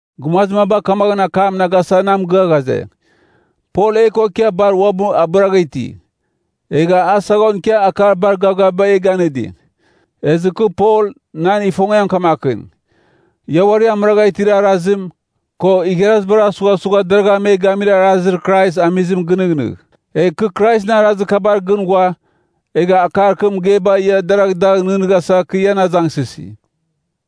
Gumazir maba kamaghɨn akam na gasa na mɨgɨa ghaze, Pol e ko ikia bar uabɨ abɨragha iti. Egha a saghon ikia akar bar gavgaviba e ganɨdi. Ezɨ kɨ Pol, nan ifongiam kamakɨn, ia uari amɨragha itir arazim, ko igharazibar asughasugha deragha me gamir arazir Krais amizim gɨnɨghnɨgh. Egh kɨ Kraisɨn arazir kabar gɨn ghua, egha akar kɨ mɨgeiba ia deragh dagh nɨghnɨghasa kɨ ian azangsɨsi.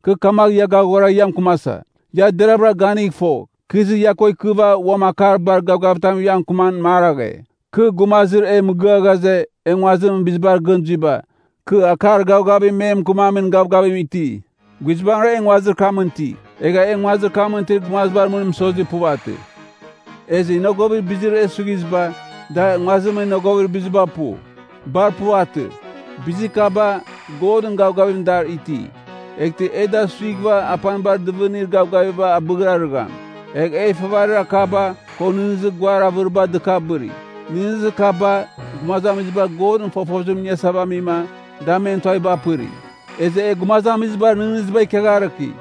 Kɨ kamagh ia gaghora ia mɨkɨmasa, ia deravɨra ganigh fogh, kɨ izɨ ia ko ikɨva uam akar bar gavgavitam ia mɨkɨman maraghe. Kɨ, gumazir e mɨgɨa ghaze, e nguazimɨn bizibar gɨn zuiba, kɨ akar gavgavim me mɨkɨmamin gavgavim iti. Guizbangɨra e nguazir kamɨn iti, egha e nguazir kamɨn itir gumazibar mɨn mɨsozir puvatɨ. Ezɨ inogovir bizir e suighiziba, da nguazimɨn inogovir biziba pu. Bar puvatɨ. Bizir kaba, Godɨn gavgavim dar iti. Eghtɨ e da suighɨva apanibar dɨvɨnir gavgavim abɨghrarɨgham. Egha e ifavarir akaba, ko nɨghnɨzir guar avɨriba dɨkabɨri. Nɨghnɨzir kaba, gumazamiziba Godɨn fofozim iniasava amima, da men tuaviba apɨri. Ezɨ e gumazamizibar nɨghnɨziba ikiagharɨki,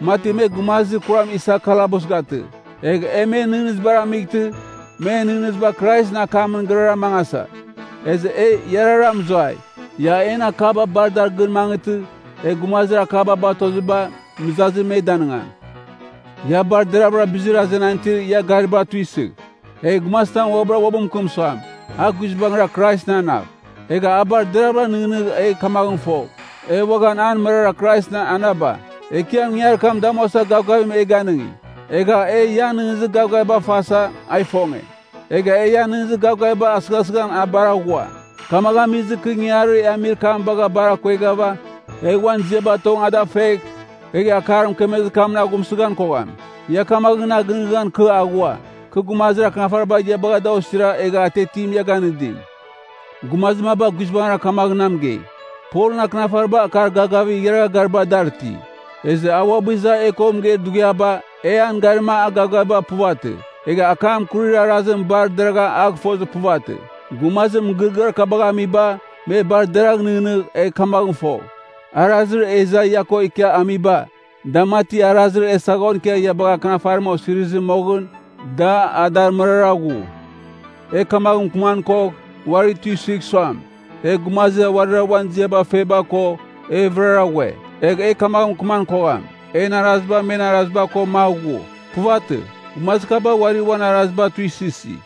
mati me gumazir kuram isa kalabus gatɨ. Egh e men nɨghnɨzibar amightɨ, men nɨghnɨziba Kraisɨn akamɨn gɨrara mangasa. Ezɨ e iarara mɨzuai. Ia en akaba bar dar gɨn mangɨtɨ, e gumazir akaba batoziba, mɨzazim me danɨngam. Ia bar deravɨra bizir azenan itir ia gariba tuisɨgh. Egh gumazitam uabɨra uabɨ mɨkɨm suam, a guizbangira Kraisɨn anav, egh a bar deravɨra nɨghnɨgh egh kamaghɨn fogh, e uaghan an mɨrara Kraisɨn ananaba. Ekiam ingangarir kam damuasa gavgavim e ganɨngi. Egha, e ian nɨghnɨzir gavgaviba fasa, a ifonge. Egha e ian nɨghnɨzir gavgavibagh asɨghasɨghan a bar aghua. Kamagh amizɨ, kɨ ingangarir e amir kam bagh bar akueghɨva, egh uan ziaba tong ada fegh, egh akar mɨkemezir kamɨn aghumsɨghan kogham. Ia kamaghɨn na gɨnɨghnɨgham kɨ aghua, kɨ gumazir akɨnafariba ia bagha da osira egha atiatim ia ganɨdim. Gumazir maba guizbangɨra kamaghɨn na mɨgei, Polɨn akɨnafariba akar gavgavir igharagha gariba dar iti. Ezɨ a uabɨ iza e ko mɨgeir dughiaba, e an garima a gavgaviba puvatɨ. Egha akam akurir arazim bar deragha a gɨfozir puvatɨ. Gumazir mɨgɨrɨgɨar kabagh amiba, me bar deragh nɨghnɨgh egh kamaghɨn fogh, arazir e iza ia ko ikia amiba, da mati arazir e saghon ikia ia bagha Akɨnafarim osirizɨ moghɨn, da adar mɨrara ghu. E kamagh mɨkɨman kogh, uari tuisɨgh suam, e gumazir uarira uan ziaba feba ko, e vɨrara ghue. Egh e kamaghɨn mɨkɨman kogham, en araziba men araziba ko magh ghu. Puvatɨ, gumazir kaba uari uan araziba tuisɨsi.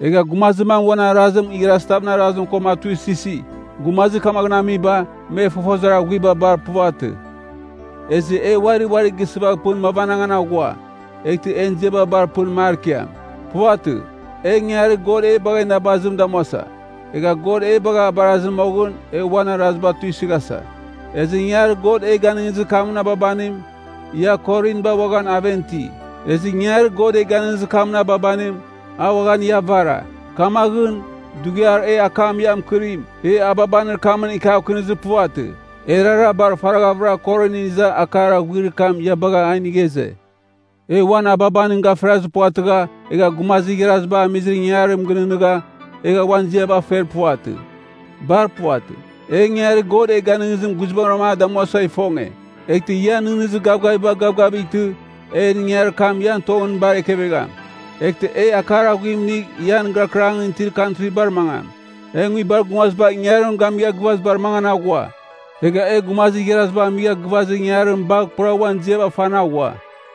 Egha gumazir mam uan arazim igharazitavɨn arazim koma a tuisɨsi. Gumazir kamaghɨn amiba, me fofozir aghuiba bar puvatɨ. Ezɨ e uari uari gisɨvagh pɨn mavanangan aghua, eghtɨ en ziaba bar pɨn mar ikiam. Puvatɨ, e ingangarir God e bagha inabazim damuasa, egh God e bagha abarazɨ moghɨn, e uan araziba tuisɨghasa. Ezɨ ingangarir God e ganɨngizir kamɨn ababanim, ia Korinba uaghan aven iti. Ezɨ ingangarir God e ganɨngizir kamɨn ababanim, a uaghan ia avara. Kamaghɨn, dughiar e akam ia mɨkɨrim, e ababanir kamɨn ikiavkɨnizir puvatɨ. Erara bar faraghavɨra Korinɨn iza akar aghuir kam ia bagha a inigha ize. E uan ababanim gafirazir puvatɨgha, egha gumazir igharaziba amizir ingangarim gɨnɨghnɨgha, egha uan ziaba fer puvatɨ. Bar puvatɨ: E ingangarir God e ganɨngizim guizbangrama a damuasa ifonge. Eghtɨ ian nɨghnɨzir gavgaviba gavgavightɨ, en ingangarir kam ian tongɨn bar ekevegham. Eghtɨ e akar aghuim inigh ian gɨrakɨrangɨn itir kantribar mangam. E nguibar gumaziba ingangarim gamigha gɨvazibar mangan aghua. Egha e gumazir igharaziba amigha gɨvazir ingangarim bagh pura uan ziaba fan aghua.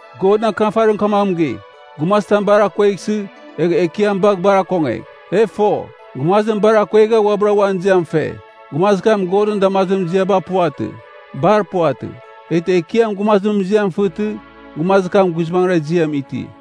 Godɨn Akɨnafarim kamaghɨn mɨgei, “Gumazitam bar akueghsɨ, egh Ekiam bagh bar akongegh.” E fo, gumazim bar akuegha uabɨra uan ziam fe, gumazir kam Godɨn damazimɨn ziaba puvatɨ. Bar puvatɨ. Eghtɨ Ekiam gumazimɨn ziam fɨtɨ, gumazir kam guizbangɨra ziam iti.